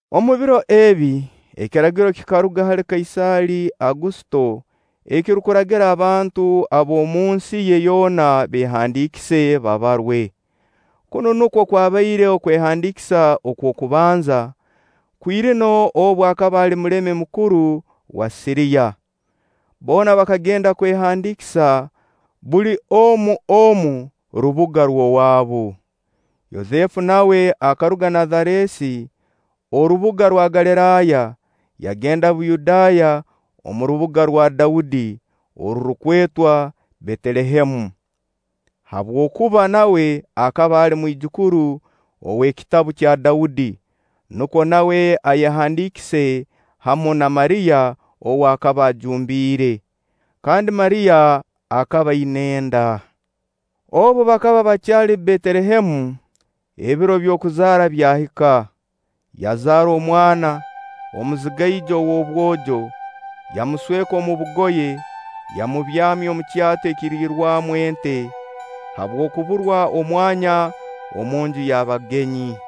Omu biro ebi, ekiragiro kikaruga hali Kaisaali Agusito ekirukuragira abantu ab'omunsi ye yoona beehandiikise, babarwe. Kunu nukwo kwabaire okwehandiikisa okw'okubanza, Kwirino obu akaba ali mulemi mukuru wa Siriya. Boona bakagenda kwehandiikisa, buli omu omu rubuga rw'owaabu. Yosefu nawe akaruga Nazareeti, orubuga rwa Galiraaya, yagenda Buyudaaya omu rubuga rwa Daudi orurukwetwa Betelehemu, habwokuba nawe akaba ali mwijukuru ow'ekitabu kya Daudi, nukwo nawe ayehandiikise hamu na Mariya ou akaba ajumbiire; kandi Mariya akaba aina enda. Obu bakaba bakyali Betelehemu, ebiro bye by'okuzaara byahika. Yazaara omwana, omuzigaijo ow'obwojo. Yamusweka omu bugoye, yamubyamya omu kyato ekiriirwamu ente, habw'okuburwa omwanya omu nju y'abagenyi.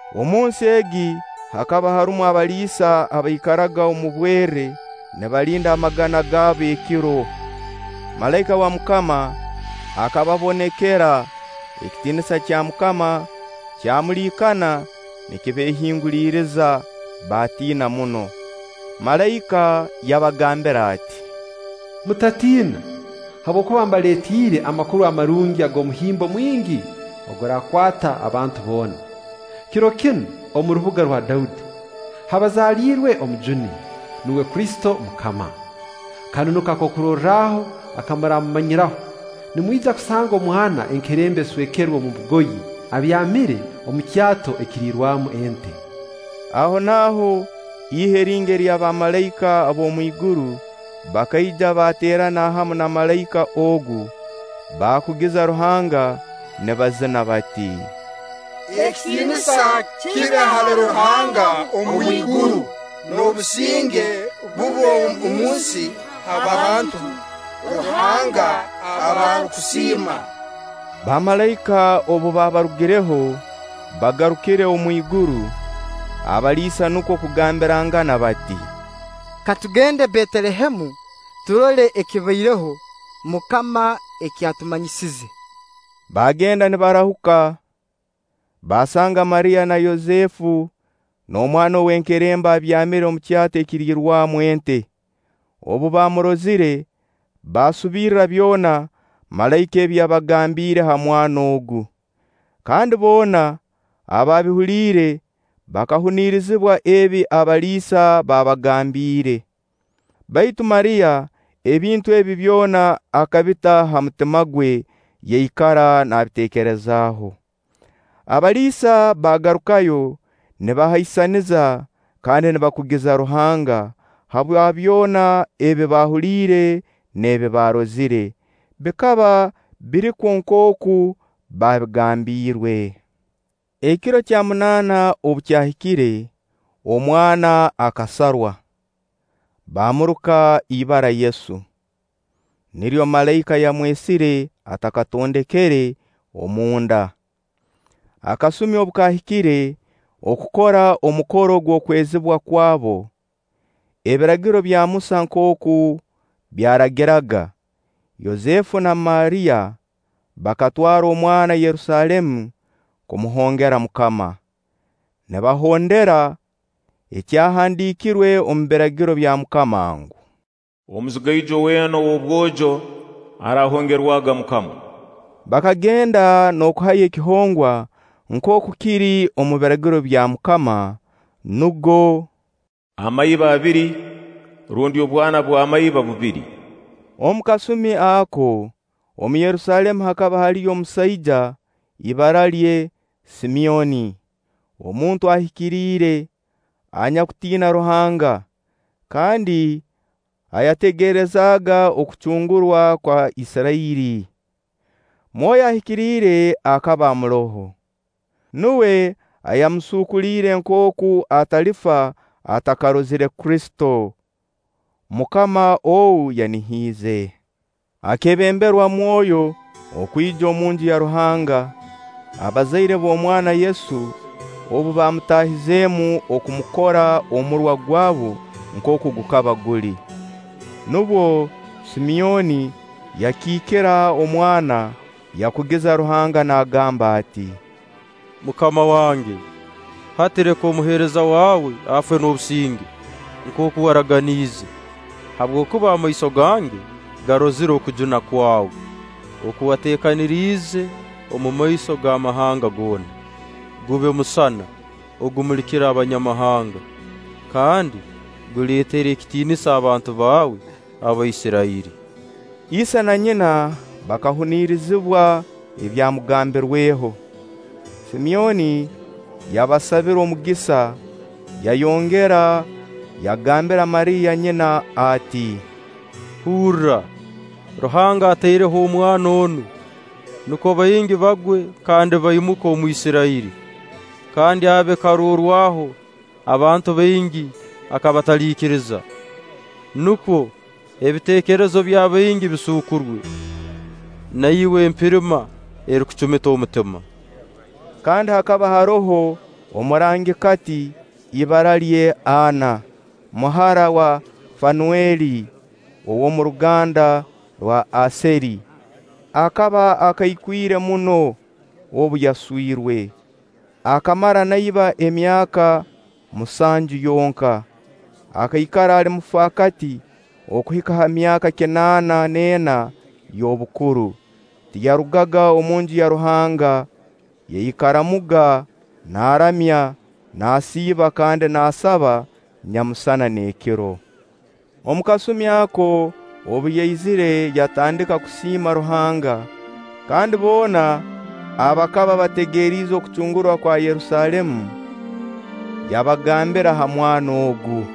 Omunsi egi hakaba harumu abaliisa abaikaraga omu bwerre nibalinda amagana gaabo ekiro. Malaika wa MUKAMA akababonekera, ekitiinisa kya MUKAMA kyamuliikana nikibeehinguliriza, baatiina muno. Malaika yabagambira ati: “Mutatiina, habwokuba mbaleetiire amakuru amarungi ag'omuhimbo mwingi oguraakwata abantu boona. Kiro kinu omu rubuga rwa Daudi, habazaliirwe Omujuni, nuwe Kristo MUKAMA. Kanu nuko karorwaho aka muraamumanyiraho: Nimwija kusanga omwana enkerembe aswekerwe omu bugoye, abyamire omu kyato ekiriirwamu ente.” Ahonaaho ihe lingi ery'abamalaika ab'omu iguru bakaija baateerana hamu na malaika ogu, baakugiza Ruhanga nibazina bati: “Ekitiinisa kibe hali Ruhanga omu iguru, n'obusinge bube omunsi ha bantu Ruhanga aba arukusiima!” Bamalaika obu baabarugireho, bagarukire omwiguru, abaliisa nukwo kugambirangana bati: “Katugende Betelehemu, turole ekibaireho MUKAMA eki atumanyisize.” Baagenda nibarahuka, baasanga Mariya na Yosefu n'omwana w'enkerembe abyamire omu kyato ekiriirwamu ente. Obu baamurozire, baasubirra byona malaika ebi yabagambiire ha mwana ogu; kandi boona abaabihuliire bakahunirizibwa ebi abaliisa baabagambiire. Baitu Mariya, ebintu ebi byona akabita ha mutima gwe, yaikara naabiteekerezaaho. Abaliisa bakagarukayo nibahaisaniza kandi nibakugiza Ruhanga habwa byona ebi baahuliire n'ebi baarozire. Bikaba birikwo nkooku baabigambiirwe. Ekiro kya munaana obu kyahikire, omwana akasarwa, baamuruka ibara Yesu. Niryo malaika yamwesire atakatondekere omu nda. Akasumi obu kaahikire okukora omukoro gw'okwezibwa kwabo, Ebiragiro bya Musa nkooku byaragiraga, Yosefu na Mariya bakatwara omwana Yerusaalemu kumuhongera MUKAMA. (nibahondera ekyahandiikirwe omu Biragiro bya MUKAMA ngu: “Omuzigaijo weena ow'obwojo araahongerwaga MUKAMA.”) Bakagenda n'okuhayo ekihongwa nkooku kiri omu Biragiro bya MUKAMA, nugo: “Amaiba abiri rundi obwana bw'amaiba bubiri.” Omu kasumi ako, omu Yerusaalemu hakaba haliyo omusaija, ibara lye Simyoni, omuntu ahikiriire, anyakutiina Ruhanga, kandi ayategerezaaga okucungurwa kwa Isirairi, Mwoyo Ahikiriire akaba amuroho. Nuwe ayamusuukuliire nkooku atalifa atakarozire Kristo, MUKAMA ou yanihiize. Akeebemberwa Mwoyo kwija omu Nju ya Ruhanga, abazaire b'omwana Yesu obu baamutaahizeemu okumukora omurwa gwabu nkooku gukaba guli. Nubwo Simyoni yakikiira omwana, yakugiza Ruhanga naagamba ati: “MUKAMA wange, hati leka omuheereza waawe afe n'obusinge, nkooku waraganiize; habwokuba amaiso gange garozire okujuna kwawe, oku wateekaniriize omu maiso g'amahanga goona, gube musana ogumulikira Abanyamahanga, kandi guleetere ekitiinisa abantu baawe Abaisirairi.” Ise na nyina bakahunirizibwa ebyamugambirweho. Simyoni yabasabira omugisa, yayongera yagambira Mariya nyina ati: “Hurra, Ruhanga ataireho omwana onu nukwo baingi bagwe kandi baimuke omu Isirairi, kandi abe karorwaho abantu baingi aka bataliikiriza. Nukwo ebiteekerezo by'abaingi bisuukurwe, (na iwe empirima erikucumita omutima).” Kandi hakaba haroho omurangikati, ibara lye Anna, muhara wa Fanueli ow'omu ruganda rwa Aseeri. Akaba akaikwire muno. Obu yaswirwe, akamara na iba emyaka musanju yonka; akaikara ali mufaakati okuhika ha myaka kinaana n'ena y'obukuru. Tiyarugaga omu Nju ya Ruhanga. Yaikaramuga naaramya, naasiiba kandi naasaba nyamusana n'ekiro. Omu kasumi ako obu yaizire yatandika kusiima Ruhanga, kandi boona abakaba bategeriize okucungurwa kwa Yerusaalemu, yabagambira ha mwana ogu.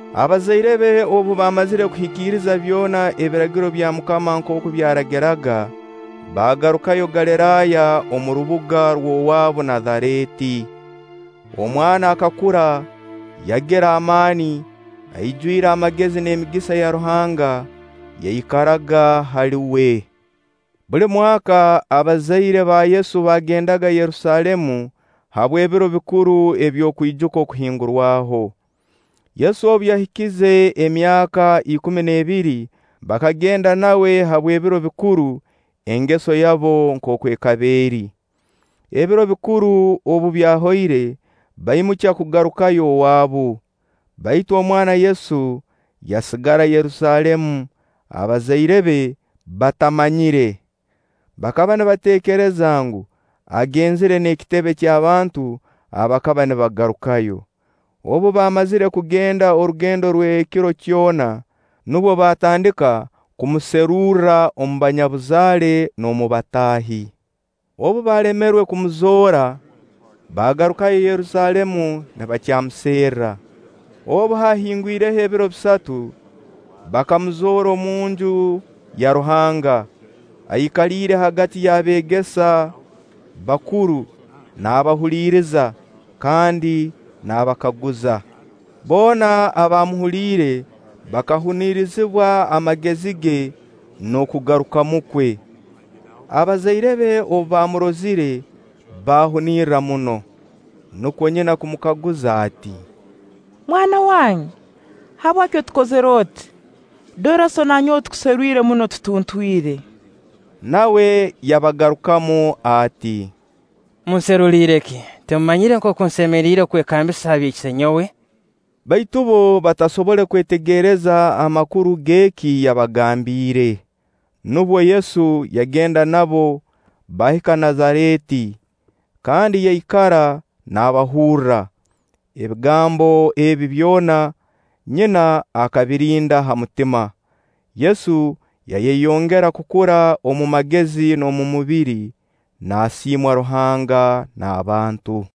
Abazaire be obu baamazire kuhikiriza byona ebiragiro bya MUKAMA nkooku byaragiraga, baagarukayo Galiraaya omu rubuga rw'owaabu Nazareeti. Omwana akakura, yagira amaani, aijwire amagezi; n'emigisa ya Ruhanga yaikaraga hali uwe. Buli mwaka abazaire ba Yesu baagendaga Yerusaalemu habw'ebiro bikuru by'okwijuka Okuhingurwaho. Yesu obu yahikize emyaka ikumi n'ebiri, bakagenda nawe habw'ebiro bikuru engeso yaabo nkooku ekaba eri. Ebiro bikuru obu byahoire baimukya kugarukayo owaabu, baitu omwana Yesu yasigara Yerusaalemu abazaire be batamanyire. Bakaba nibateekereza ngu, agenzire n'ekitebe ky'abantu abakaba nibagarukayo. Obu baamazire kugenda orugendo rw'ekiro kyona, nubwo baatandika kumuserurra omu banyabuzaale n'omu bataahi. Obu baalemerwe kumuzoora, baagarukayo Yerusaalemu nibakyamuserra. Obu haahingwireho ebiro bisatu, bakamuzoora omunju ya Ruhanga, aikaliiire hagati y'abeegesa bakuru naabahuliriza kandi naabakaguza. Boona abaamuhuliire bakahunirizibwa amagezi ge n'okugarukamu kwe. Abazaire be obu baamurozire, baahunirra muno; nukwo nyina kumukaguza ati: “Mwana wange, habwaki otukozire oti? Dora sso na nyowe tukuserwire muno tutuntwire.” Nawe yabagarukamu ati: “Munseruliire ki? Timumanyire nkooku nsemeriire kwekambisa ha bya Isenyowe?” Baitu bbo batasobole kwetegereza amakuru g'eki yabagambiire. Nubwo Yesu yagenda nabo baahika Nazareeti, kandi yaikara naabahurra. Ebigambo ebi byona, nyina akabirinda ha mutima. Yesu yayeyongera kukura omu magezi n'omu mubiri, naasiimwa Ruhanga n'abantu.